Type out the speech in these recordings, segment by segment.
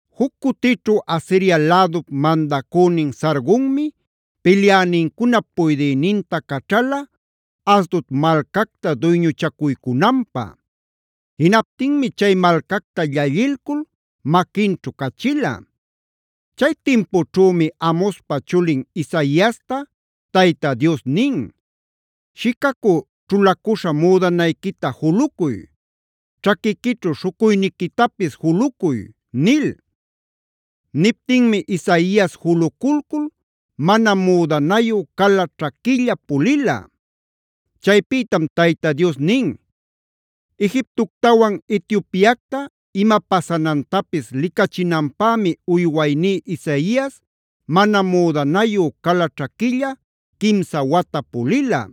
Juc cutićhu Asiria lädup mandacünin Sargonmi pilyänincunap puydïninta caćhala, Asdod malcacta duyñuchacuycunanpä. Jinaptinmi chay malcacta llallilcul maquinćhu cachila. Chay timpućhümi Amozpa chulin Isaiasta Tayta Dios nin: “Shicacü ćhulacuśha müdanayquita julucuy; ćhaquiquićhu śhucuyniquitapis julucuy” nil. Niptinmi Isaias juluculcul mana müdanayu, cala ćhaquilla pulila. Chaypïtam Tayta Dios nin: “Egiptoctawan Etiopiacta ima pasanantapis licachinanpämi uywayní Isaias mana müdanayu, cala ćhaquilla quimsa wata pulila.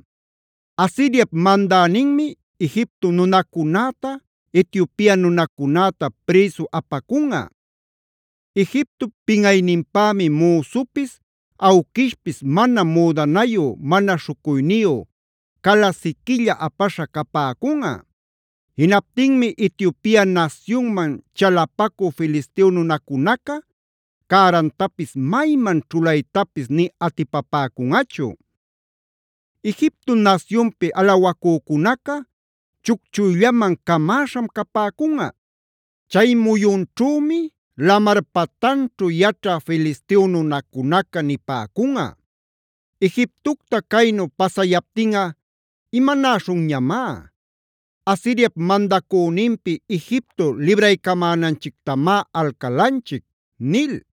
Asiriap mandäninmi Egipto nunacunäta, Etiopia nunacunäta prïsu apacunꞌa. Egiptop pinꞌayninpämi müsupis awquishpis mana müdanayu, mana śhucuyniyu, cala siquilla apaśha capäcunꞌa. Jinaptinmi Etiopia nasyunman chalapacü Filisteo nunacunaca cärantapis mayman ćhulaytapis nï atipapäcunꞌachu; Egipto nasyunpi alawacücunaca chucchuyllaman camäśham capäcunꞌa. Chay muyunćhümi lamar patanćhu yaćhä Filisteo nunacunaca nipäcunꞌa: ‘Egiptocta caynu pasayaptinꞌa ¿imanäśhunñamá? Asiriap mandacüninpi Egipto libraycamänanchictamá alcalanchic’” nil.